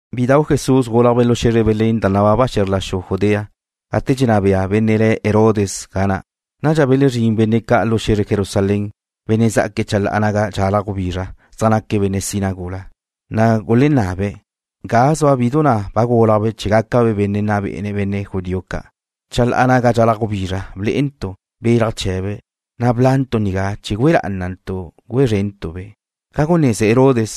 Bidau' Jesús gúlajbe' lu xe̱zre Belén da nababa xe̱zr la xu Judea gate dxenná bea benne' le̱' Herodes ga na'. Nadxa belezrín benne' ca' lu xe̱zre Jerusalén, benne' zá'aque̱' chalá'a naga dxalaj gubizra, zaj naque̱' benne' sina gula. Na' gulenabe̱': ―¿Ga zua bidu na' ba gúlajbe' chee̱ gácabe' benne' nna bé'ene̱' benne' judío ca'? Gate zuantu' chalá'a naga dxalaj gubizra blé'entu' belaj chee̱be', na' bla'ntu' nigá chee̱ gúe lá'ana gúe szrentu'-be'. Ca guneze Herodes,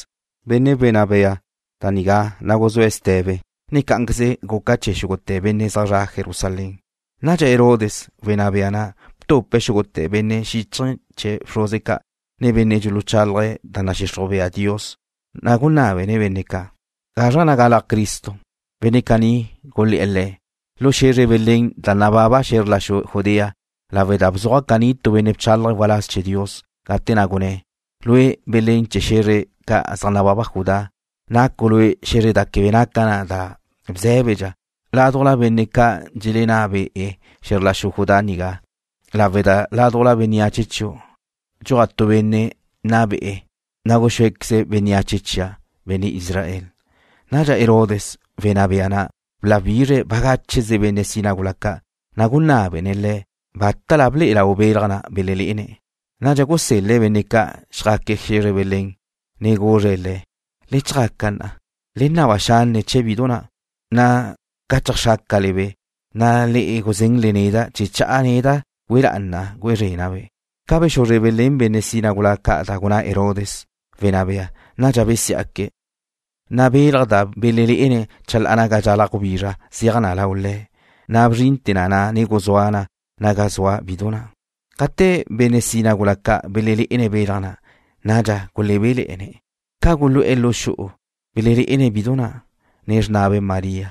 benne' wenná bea, da nigá, na' guzúe̱' ste̱be, ne cá'anqueze guca chee̱ xúgute̱ benne' zaj zre̱'e̱ Jerusalén. Nadxa Herodes, wenná bea na', btupe̱' xúgute̱ benne' xíchaje̱ chee̱ bxruze ca', ne benne' dxuluxuzájle̱'e̱ da nadxixruj bea Dios, na' gunábene̱' benne' ca': ―¿Gazra na' galaj Cristo? Benne' caní gulé̱'e̱ le̱': ―Lu xe̱zre Belén da nababa xe̱zr la xu Judea, lawe' da bzuaj caní tu benne' bchálaje̱' waláz chee̱ Dios, gate na' gunné̱': Lue', Belén chee̱ xe̱zre ca' zaj nababa na Judá, nacu' lue' xe̱zre da quebe naca na da bzé̱bedxa ládujla benne' ca' dxelenná be'ene̱' xe̱zr la xu Judá nigá, lawe' da ládujla bénneache chiu' dxuaj tu benne' nna be'e̱, na' guxúequeze̱' bénneache chia', benne' Israel. Nadxa Herodes, wenná bea na', bláwizre̱' bagácheze benne' sina gula ca', na' gunábene̱' le̱' bátala ble'e lau belaj na' belelé'ene̱'. Nadxa gusel-le̱' benne' ca' chjaque̱' xe̱zre Belén, ne guzre̱' le̱': ―Le chjaca na', ne le naba xanne' chee̱ bidu na', na' ca cheajxrácale-be', na' le guzén neda' chee̱ cha'a neda' gúe lá'ana gúe szrena'-be'. Ca bexuzre belén benne' sina gula ca da gunná Herodes, wenná bea, nadxa besiá'que̱', na' belaj da belelé'ene̱' gate zaj zre̱'e̱ chalá'a naga dxalaj gubizra zeaj na lau le̱', na' bzrinte̱ na, ne guzúa na naga zua bidu na'. Gate benne' sina gula ca' belelé'ene̱' belaj na', nadxa gulebéle̱'e̱ne̱'. Ca gulu'e̱ lu xu'u, belelé'ene̱' bidu na', ne xrnabe' María.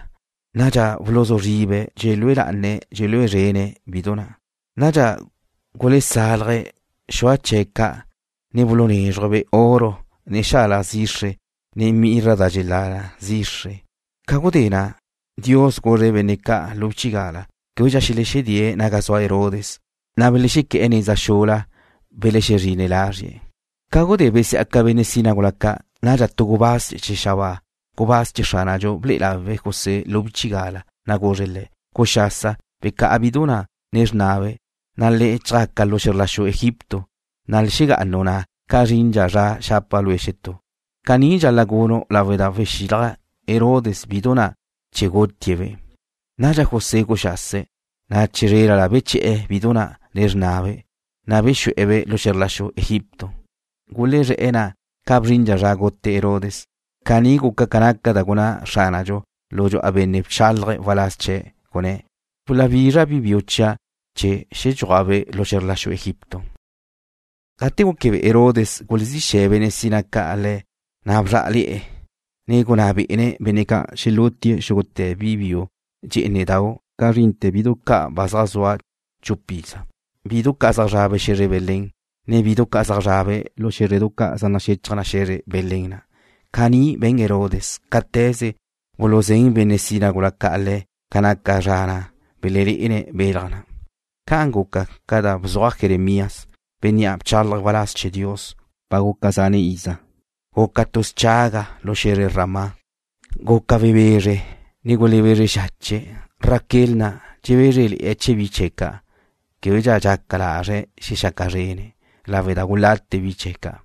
Nadxa buluzú zribe̱' dxelúe lá'ana dxelúe szrene̱' bidu na'. Nadxa gulesálaje̱' xua chee̱' ca', ne bulunézruje̱'-be' oro, ne xalaj zixre, ne mirra da naca na zichaj. Ca gudé na', Dios guzre̱' benne' ca' lu bchigala québedxa xelexedée̱' naga zua Herodes. Chee̱ le̱ na belexequé̱'e̱ neza xula, belexezrine̱' lazrie̱'. Ca gudé besí'aca benne' sina gula ca', nadxa tu gubáz chee̱ xabáa, gubáz chee̱ Xránadxu ble'e lawe̱' José lu bchigala, na' guzre̱' le̱': ―Guxasa. Becá'a bidu na', ne xrnabe', na' le chjaca lu xe̱zr la xu Egipto, na' xegá'anu' ga na' ca zrindxa zra xapa' lue' xetú. Caní dxal-la' gunu' lawe' da wexilaj Herodes bidu nigá chee̱ gutie̱'-be'. Nadxa José guxase̱', na' chizrélala beche̱'e̱ bidu na', ne xrnabe', na' bexu'e̱-be' lu xe̱zr la xu Egipto. Gulezré̱'e̱ na' ca bzrindxa zra gute Herodes. Caní guca ca naca da gunná Xránadxu lu dxu'a benne' bchálaje̱' waláz chee̱', gunné̱': “Xuláwizra' bi biu chia' chee̱ xedxúajbe' lu xe̱zr la xu Egipto.” Gate gúquebe'e Herodes gulezí xe̱ benne' sina ca' le̱', na' bzrá'ale̱'e̱, ne gunná bé'ene̱' benne' ca' xelútie̱' xúgute̱ bi biu dxé'enedau', ca zrinte̱ bidu ca' ba zaj zua chup iza, bidu ca' zaj zrabe' xe̱zre Belén, ne bidu ca' zaj zrabe' lu xé̱zredu ca' zaj naxechaj na xe̱zre Belén na'. Caní be̱n Herodes cáte̱ze buluzén benne' sina gula ca' le̱' ca naca zra na' belelé'ene̱' belaj na'. Ca'an guca ca da bzuaj Jeremías, bénnea' bchálaje̱' waláz chee̱ Dios ba guca zan' iza, gunné̱': Guca tu schaga lu xe̱zre Ramá. Guca webezre, ne gulebezre xache̱'. Raquel na' dxebézrele̱'e̱ chee̱ bi chee̱' ca'. Québequeze dxaca lazre̱' xexaca zrene̱' lawe' da ba gulate bi chee̱' ca'.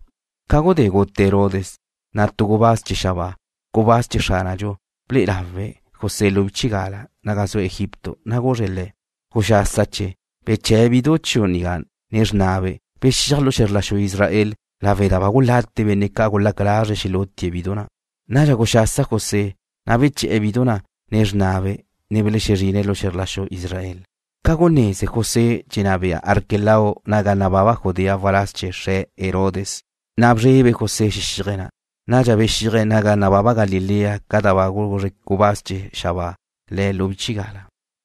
Ca gudé gute Herodes, na' tu gubáz chee̱ xabáa, gubáz chee̱ Xránadxu ble'e lawe̱' José lu bchigala naga zue̱' Egipto, na' guzre̱' le̱': ―Guxásache. Beche̱'e̱ bidu chiu' nigá, ne xrnabe'. Bexíaj lu xe̱zr la xu Israel, lawe' da ba gulate benne' ca' gulaca lazre̱' xelútie̱' bidu nigá. Nadxa guxasa José, na' beche̱'e̱ bidu na', ne xrnabe', na' belexezrine̱' lu xe̱zr la xu Israel. Ca guneze José dxenná bea Arquelao naga nababa Judea waláz chee̱ xre̱', Herodes na', na' bzrebe José xexíaje̱' ga na'. Nadxa bexíaje̱' naga nababa Galilea ca da ba guzre gubáz chee̱ xabáa le̱' lu bchigala.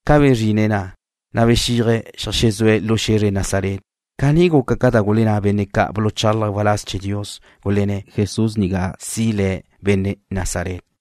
Ca bezrine̱' na', na' bexíaje̱' cheajxezúe̱' lu xe̱zre Nazaret. Caní guca ca da gulenná benne' ca' buluchálaje̱' waláz chee̱ Dios, gulenné̱' Jesús nigá si le̱' benne' Nazaret.